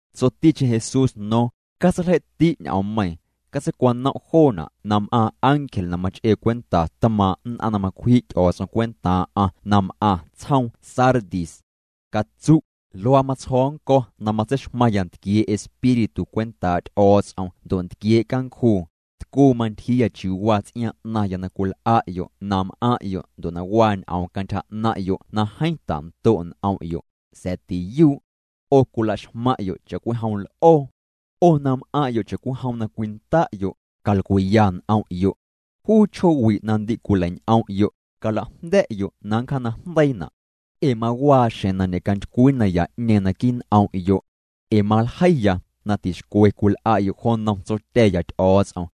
Tsoticheⁿ Jesús no̱o̱ⁿ: —Catseiljei'ti' ñ'oommeiiⁿ, catseicwanom' joona' nam'aaⁿ ángel na mach'ee cwenta tmaaⁿ' nn'aⁿ na macwji' Ty'o̱o̱ts'om cwentaaⁿ'aⁿ na m'aⁿ tsjoom Sardis. Catsu': “Luaa matsjo̱o̱ nnco̱ na matseixmaⁿya ntquiee' Espíritu cwentaa' Ty'o̱o̱ts'om ndo' ntquiee' cancjuu: Tcuu mantyjiiya chiuu waa ts'iaaⁿ 'naⁿya na cwil'a'yo' na m'aⁿ'yo' ndo' na waa ñ'oom cantyja 'naⁿ'yo' na jeeⁿ tando' n'om'yo', sa̱a̱ tiyuu'. 'O cwilaxmaⁿ'yo' cha'cwijom l'oo. 'O na m'aⁿ'yo' cha'cwijom na cwinda'yo', calcwiiya n'om'yo'. Juu chjoowi' na ndi cwileiñ'om'yo', calajnda̱'yo' na nncjaanajndeiina'. Ee mawaa xjeⁿ na ñe'cantycwii naya'ñeeⁿ naquii' n'om'yo'. Ee maljeiya na tixcwe cwil'a'yo' jo nnom Tsotya̱ya Ty'o̱o̱ts'om.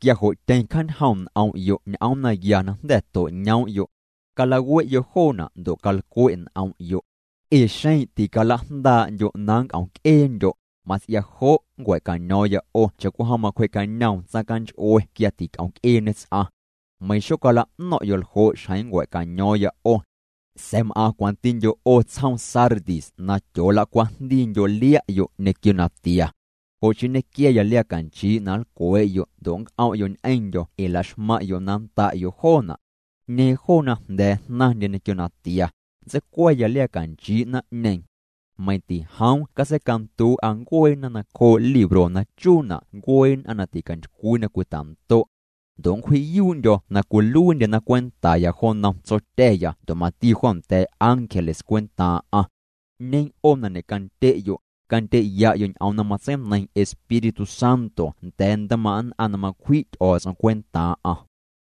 Quia jo' tyeⁿ cjaañjoom' n'om'yo' ñ'oom naya na jnda̱ to'ñoom'yo'. Calawe'yo' joona' ndo' calcwe' n'om'yo'. Ee xeⁿ ticalajndaa'ndyo' na nnc'om'c'eendyo', mats'ia jo' nncua̱caño̱o̱ⁿya 'o cha'cwijom macwjee'cañoom tsaⁿcanch'ue quia tic'omc'eeñe ts'aⁿ. Meiⁿ xocala'no̱ⁿ'yo' ljo' xjeⁿ nncua̱caño̱o̱ⁿya 'o. Sa̱a̱ m'aⁿ cwantindyo' 'o tsjoom Sardis na tyoolacwajndiindyo' lia'yo' ñequio natia. Jo' chii nñequiaya liaa canchii' na nlcwee'yo' ndo' nnc'om'yo' ñ'eⁿndyo̱ ee la'xmaⁿ'yo' na nnda'yo' joona'. 'Ñeeⁿ joo na jnda̱a̱ jnaⁿndye ñequio natia, nntseicwa̱ya liaa canchii' naⁿ'ñeeⁿ. Meiⁿ tijoom catseicanduu'a ncueena nacjoo' libro na chuuna' ncuee nn'aⁿ na ticantycwii na cwita'ndo'. Ndo' nncwji'yuu'ndyo̱ na cwiluiindyena cwentaya jo nnom Tsotya̱ya ndo' mati jo nda̱a̱ ángeles cwentaaⁿ'aⁿ. 'Ñeeⁿ 'o na ñe'candye'yo', candye'ya'yo' ñ'oom na matseineiⁿ Espíritu Santo nda̱a̱ ntmaaⁿ' nn'aⁿ na macwji' Ty'o̱o̱ts'om cwentaaⁿ'aⁿ.”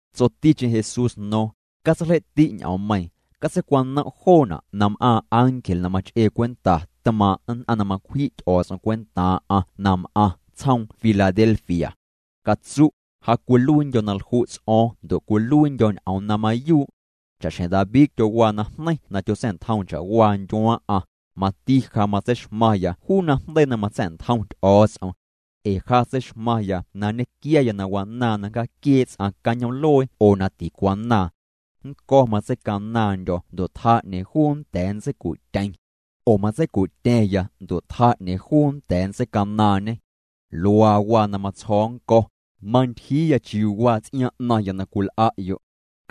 Tsoticheⁿ Jesús no̱o̱ⁿ: —Catseiljei'ti' ñ'oommeiiⁿ, catseicwanom' joona' nam'aaⁿ ángel na mach'ee cwenta tmaaⁿ' nn'aⁿ na macwji' Ty'o̱o̱ts'om cwentaaⁿ'aⁿ na m'aⁿ tsjoom Filadelfia. Catsu': “Ja cwiluiindyo̱ na lju' ts'o̱o̱ⁿ ndo' cwiluiindyo̱ ñ'oom na mayuu'. Cha'xjeⁿ David tyowaa najneiⁿ na tyotsa̱'ntjoom cha'waa ndyuaaⁿ'aⁿ, mati ja matseixmaⁿya juu najndeii na matsa̱'ntjom Ty'o̱o̱ts'om. Ee ja tseixmaⁿya na nñequiaya na wanaaⁿ na nncjaaquiee' ts'aⁿ cañoom'luee oo na ticwanaaⁿ. Nnco̱ matseicanaaⁿndyo̱ ndo' tjaa 'ñeeⁿ juu nnda̱a̱ nntseicu'tyeⁿ. Oo matseicu'tya̱ⁿya ndo' tjaa 'ñeeⁿ juu nnda̱a̱ nntseicanaaⁿñe. Luaa waa na matsjo̱o̱ nnco̱: Mantyjiiya chiuu waa ts'iaaⁿ 'naⁿya na cwil'a'yo'.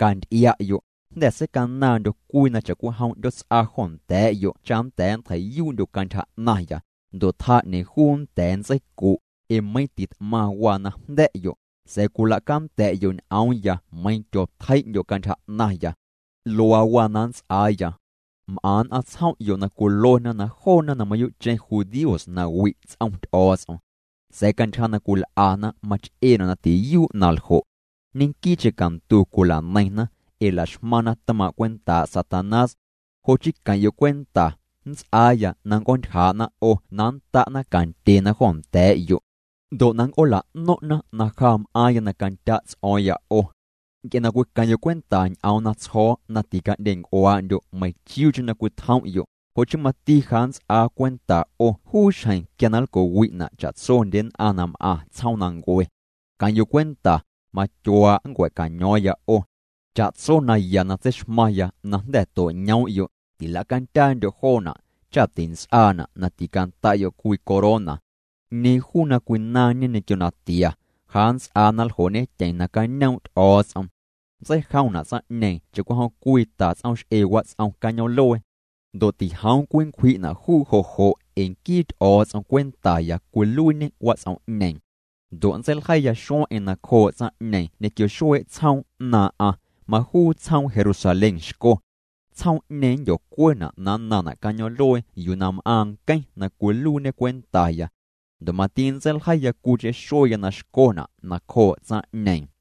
Canty'ia'yo', jnda̱ seicanaaⁿndyo̱ cwii cha'cwijom 'ndyoots'a jo nda̱a̱'yo' cha nnda̱a̱ nntjei'yuu'ndyo' cantyja 'naⁿya, ndo' tjaa 'ñeeⁿ juu nnda̱a̱ nntseicu'. Ee meiiⁿ tit'maⁿ waa na jnda̱'yo', sa̱a̱ cwilacanda̱'yo' ñ'oomya meiⁿ tyootjei'ndyo' cantyja 'naⁿya. Luaa waa na nnts'aaya. M'aⁿ nn'aⁿ tsjom'yo' na cwiluena na joona na mayuu'cheⁿ judíos na wi' ts'om Ty'o̱o̱ts'om. Sa̱a̱ cantyja na cwil'ana mach'eena' na tiyuu' na ljo'. Ñenquii'cheⁿ cantu cwila'neiⁿna, ee la'xmaⁿna tmaaⁿ' cwentaa' Satanás. Jo' chii queⁿ'yo' cwenta, nnts'aaya na nnc'oontyjaa'na 'o na nnta'na cantyena jo nda̱a̱'yo'. Ndo' na nnc'oola'no̱ⁿ'na na ja m'aaⁿya na candya' ts'o̱o̱ⁿya 'o. Nc'e na cwiqueⁿ'yo' cwenta ñ'oom na tsjo̱o̱ na tica'ndyenc'uaa'ndyo' meiⁿchiuucheⁿ na cwitjom'yo', jo' chii mati ja nnts'aa cwenta 'o juu xjeⁿ quia na nlco'wi'na' cha'tsondye nn'aⁿ na m'aⁿ tsjoomnancue. Queⁿ'yo' cwenta, matyuaa' nncua̱caño̱o̱ⁿya 'o. Cha'tso naya na tseixmaⁿya na jnda̱ to'ñoom'yo', tila'candyaandyo' joona', cha' tints'aana' na ticanda'yo' cwii corona. 'Ñeeⁿ juu na cwinaⁿñe ñequio natia, ja nnts'aa na nljoo'ñetyeⁿ nacañoom' Ty'o̱o̱ts'om. Nntseijomna' tsaⁿ'ñeeⁿ cha'cwijom cwii ta ts'oomx'ee wats'om cañoom'luee. Ndo' tijoom cwinncwji'na' juu jo' ee nquii Ty'o̱o̱ts'om cwentaya cwiluiiñê wats'om'ñeeⁿ. Ndo' nntseiljeiya xueⁿ'eⁿ nacjoo' tsaⁿ'ñeeⁿ ñequio xuee' tsjoom 'naaⁿ'aⁿ, majuu tsjoom Jerusalén xco. Tsjoom'ñeeⁿ nndyocuena' na nnaⁿna' cañoom'luee yuu na m'aaⁿ nqueⁿ na cwiluiiñê cwentaya. Ndo' mati nntseiljeiya cwiicheⁿ xueya na xcona' nacjoo' tsaⁿ'ñeeⁿ.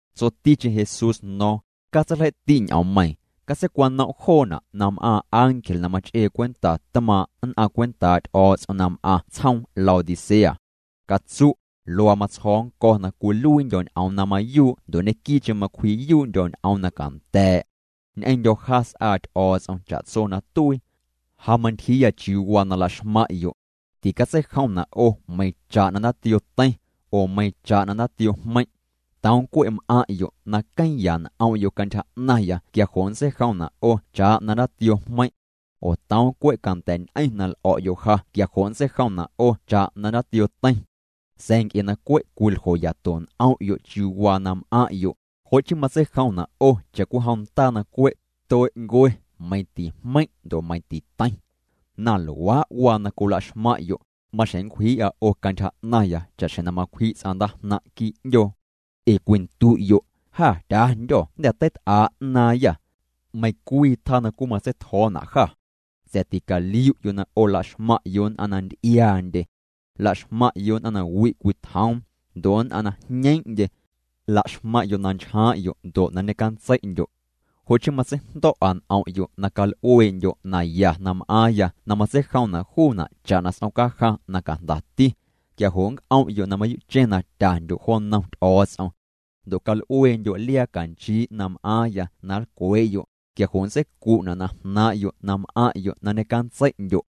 Tsoticheⁿ Jesús no̱o̱ⁿ: —Catseiljei'ti' ñ'oommeiiⁿ, catseicwanom' joona' nam'aaⁿ ángel na mach'ee cwenta tmaaⁿ' nn'aⁿ cwentaa' Ty'o̱o̱ts'om na m'aⁿ tsjoom Laodicea. Catsu': “Luaa matsjo̱o̱ nnco̱ na cwiluiindyo̱ ñ'oom na mayuu' ndo' ñequii'cheⁿ macwji'yuu'ndyo̱ ñ'oom na canda̱a̱'. Ñ'eⁿndyo̱ ja s'aa Ty'o̱o̱ts'om cha'tso na tuii. Ja mantyjiiya chiuu waa na la'xmaⁿ'yo'. Ticatseijomna' 'o meiⁿ cha'na ndaatioo teiⁿ, oo meiⁿ cha'na ndaatioo jmeiⁿ'. Toom cwe' m'aⁿ'yo' na queeⁿya n'om'yo' cantyja 'naⁿya quia jo' nntseijomna' 'o cha'na ndaatioo jmeiⁿ'. Oo toom cwe' canda̱'ñ'eⁿ na l'o̱'yo' ja quia jo' nntseijomna' 'o cha'na ndaatioo teiⁿ. Sa̱a̱ nc'e na cwe' cwiljoyato n'om'yo' chiuu waa na m'aⁿ'yo', jo' chii matseijomna' 'o cha'cwijom ndaa na cwe' tue'ncue, meiⁿ tijmeiⁿ' ndo' meiⁿ titeiⁿ. Na luaa' waa na cwila'xmaⁿ'yo', maxjeⁿ nncwjii'a 'o cantyja 'naⁿya cha'xjeⁿ na macwji' ts'aⁿ ndaajnaⁿ' quii' 'ndyoo. Ee cwindu'yo': Jâ tyandyô̱, jnda̱ teit'aa' 'naaⁿyâ. Meiⁿ cwii tjaa na cwimatseitjo̱o̱na' jâ. Sa̱a̱ ticaliu'yo' na 'o la'xmaⁿ'yo' nn'aⁿ na nty'iaa'ndye. La'xmaⁿ'yo' nn'aⁿ na wi' cwitjoom, ndo' nn'aⁿ na jñeeⁿ'ndye. La'xmaⁿ'yo' na nchjaaⁿ'yo' ndo' na ñecantsei'ndyo'. Jo' chii matseijndo̱'a n'om'yo' na cal'uee'ndyo' naya na m'aaⁿya na matseijomna' juuna' cha'na s'om cajaⁿ na cajndati, quia jo' nnc'om'yo' na mayuu'cheⁿ na tyandyo' jo nnom Ty'o̱o̱ts'om. Ndo' cal'ueendyo' liaa canchii' na m'aaⁿya na nlcwee'yo', quia jo' nntseicu'na' na jnaaⁿ'yo' na m'aⁿ'yo' na ñecantsei'ndyo'.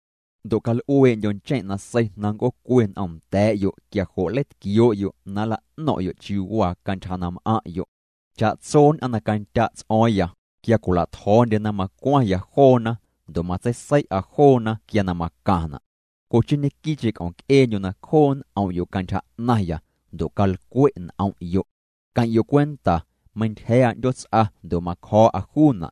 Ndo' cal'uee'ndyo' ncheⁿ' nasei na nnc'oocue n'omnda̱a̱'yo' quia jo' nleitquioo'yo' na nla'no̱ⁿ'yo' chiuu waa cantyja na m'aⁿ'yo'. Cha'tso nn'aⁿ na candya' ts'o̱o̱ⁿya, quia cwila'tjo̱o̱ndyena macwaⁿya joona, ndo' matseisei'a joona quia na macaⁿna'. Jo' chii ñequii'cheⁿ c'om'yo' na cjoo' n'om'yo' cantyja 'naⁿya, ndo' calcwe' n'om'yo'. Queⁿ'yo' cwenta, meintyja̱a̱'a 'ndyoots'a ndo' macjo̱o̱'a juuna'.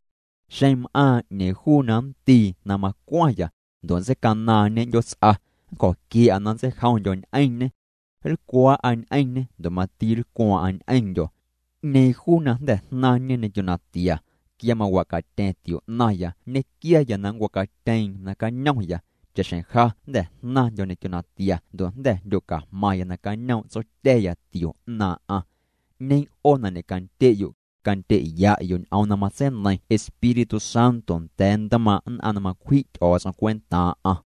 Xeⁿ m'aaⁿ 'ñeeⁿ juu na nndii na macwaⁿya, ndo' nntseicanaaⁿñe 'ndyoots'a, nncjo̱quia̱'a na nntseijomndyo̱ ñ'eⁿñê. Nlcwaa'a ñ'eⁿñê ndo' mati nlcwaaⁿ'aⁿ ñ'eⁿndyo̱. 'Ñeeⁿ juu na jnda̱ jnaⁿñe ñequio natia, quia mawa'catya̱ⁿ tio 'naⁿya, nñequiaya na nncwa'catyeeⁿ na cañomya, cha'xjeⁿ ja jnda̱ jnaⁿndyo̱ ñequio natia ndo' jnda̱ jndyocajmaⁿya nacañoom' Tsotya̱ya tio 'naaⁿ'aⁿ. 'Ñeeⁿ 'o na ñe'candye'yo', candye'ya'yo' ñ'oom na matseineiⁿ Espíritu Santo nda̱a̱ ntmaaⁿ' nn'aⁿ na macwji' Ty'o̱o̱ts'om cwentaaⁿ'aⁿ.”